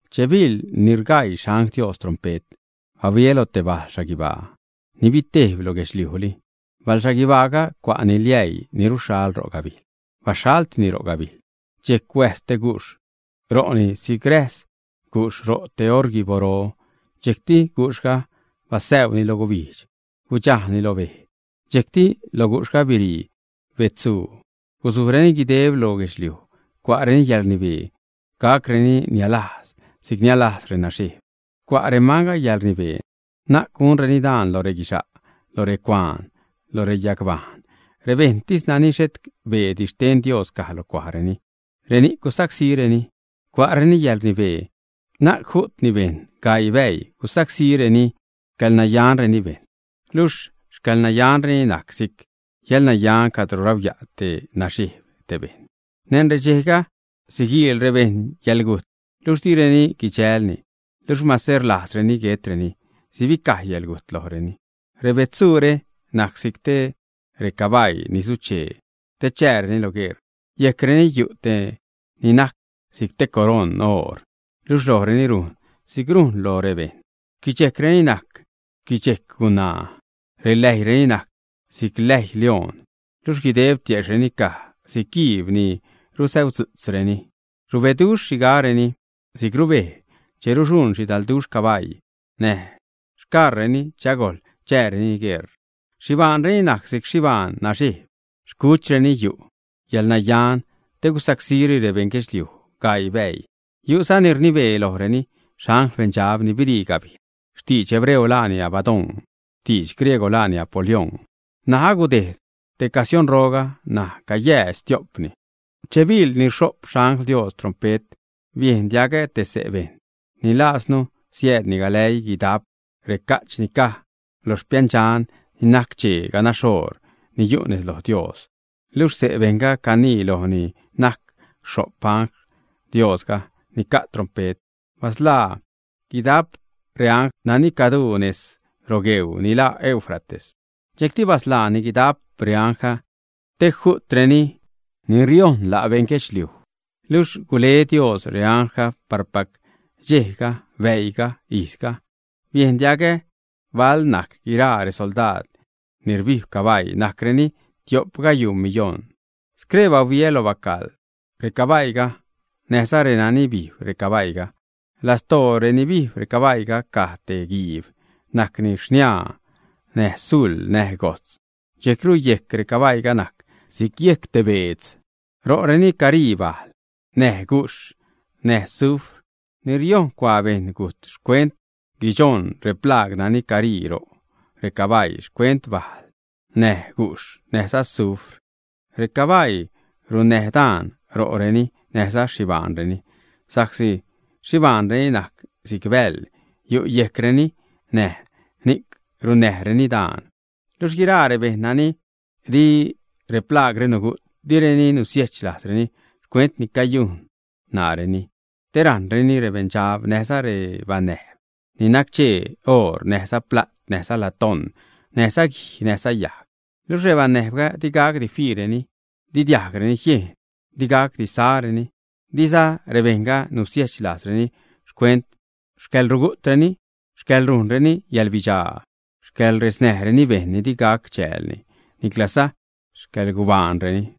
Che biḻ ni rgaii xangl Dios trompe't, bahuiä lo te bal xhaguibaa ni bitejb lo guedxliujli. Bajl xhaguibaaga cua'ni liäii ni ruxhal ro' gabijl. Baxhaltini ro' gabijl, dxejc huäjs te gujxh ro'ni si'c räjs gujxh ro' te orguiboro. Dxejcti gujxhga basäuni loj gubijdx, gudxajni lo bej. Dxejcti lo gujxhga birii betzsu gusujreni guideb lo guedxliuj. Cua'reni yäḻrnibee gacreni nialajz si'c nialajz renaxejb. Cua' remanga yäḻrnibee na'c gunreni daan loj reguixa', loj recuaan, loj reyagbajṉ; rebejṉtis nani xhet beedi xten Dios caj lo cuajreni, reni'c gusacsíreni. Cua'reni yäḻrnibee na'c ju'tni bejṉ, gaii bäii gusacsíreni xcäḻnayanreni bejṉ. Luxh xcäḻnayanreni najc si'c yäḻnayan cadro rauya' te naxejb te bejṉ. Neṉ redxejga, siguiil rebejṉ yäḻgujt, luxh direni guidxälni. Luxh mase rlajzreni guetreni, sibicaj yäḻgujt lojreni. Rebetzsure najc si'c recabaii ni suchee te chääreni lo gueṟ. Yejcreni yu' te ni najc si'c te coroṉ oor; luxh lojreni rujn si'c loj rebejṉ. Xquichejcreni si'c najc xquichejc gunaa; reläjyreni najc si'c läjy lioṉ. Luxh guideb tiejxhreni caj si'c guiib ni rusäudzu'tzreni. Rubeduxh rexhigaareni, si'c rubej che ruxuṉ xhidalduxh cabaii näj xcaṟreni che agojl chääreni gueṟ. Xhibaanreni najc si'c xhibaan naxejb, xcuchreni yu' yäḻnayan te gusacsíreni rebeṉ guedxliuj gaii bäii. Yu'za ni rnibee lojreni, xangl beṉdxab ni birii gabijl. Xtidx hebreo laani Abadón, xtidx griegw, laani Apolión. N̲aj agudejd tej casionroga, ṉaj cayäädx stio'pni. Che biḻ ni rxho'p xangl Dios trompe't, biejn diagä te xse' bejṉ ni lascanu siäädni galäii guidajp reca'ch ni caj loj xpiändxan ni nac-chee ganax oor, ni yu' nez loj Dios. Luxh xse' bejṉga canii loj ni najc rxho'p xangl Diosga, ni ca' trompe't: ―Basḻaa guidap reangl nani caduu nez rogueuu ni laa Eufrates. Dxejcti basḻaani guidap reanglga te ju'treni ni riojṉ la' beṉ guedxliuj. Luxh gule Dios reanglga parpac dxejga, bäiiga, ijzga. Biejn diagä bal najc guiraa resoldaad ni rbijb cabaii: najcreni tio'p gayuu miyoṉ. Scree bahuiä lo bacaḻ recabaiiga näjza renani bijb recabaiiga. Lastoo reni bijb recabaii caj te guiib, najcni xniaa näj zul näj gojtz. Dxejcru yejc recabaiiga najc si'c yejc te beedz. Ro'reni carii bajl näj gujxh, näj sufr. Ni riojṉ cuaa bejṉ gujt xcuent guichoṉ replaag nani carii ro' recabaii, xcuent bajl näj gujxh, näjza sufr. Recabaii runnäj daan ro'reni näjza xhibaanreni, sa'csi xhibaanreni najc si'c bäḻ, yu' yejcreni, näj ni'c runnäjreni daan. Luxh guiraa rebejṉ nani di replaagre nugu't, direni nusiejch lajzreni xcuent ni cayujn ṉaareni, te rajṉreni rebeṉdxab, näjza rebanäjb ni nac-chee oor, näjza pla't, näjza latón, näjza guij, näjza yajg. Luxh rebanäjbga di gacdi fiireni, di diajgreni jiejn, di gacdi sareni. Diza rebejṉga nusiejch lajzreni xcuent xcäḻrugu'treni, xcäḻrujnreni yäḻbidxaa, xcäḻresnäjreni bejṉ ni di gac chäälni, niclaza xcäḻgubaanreni.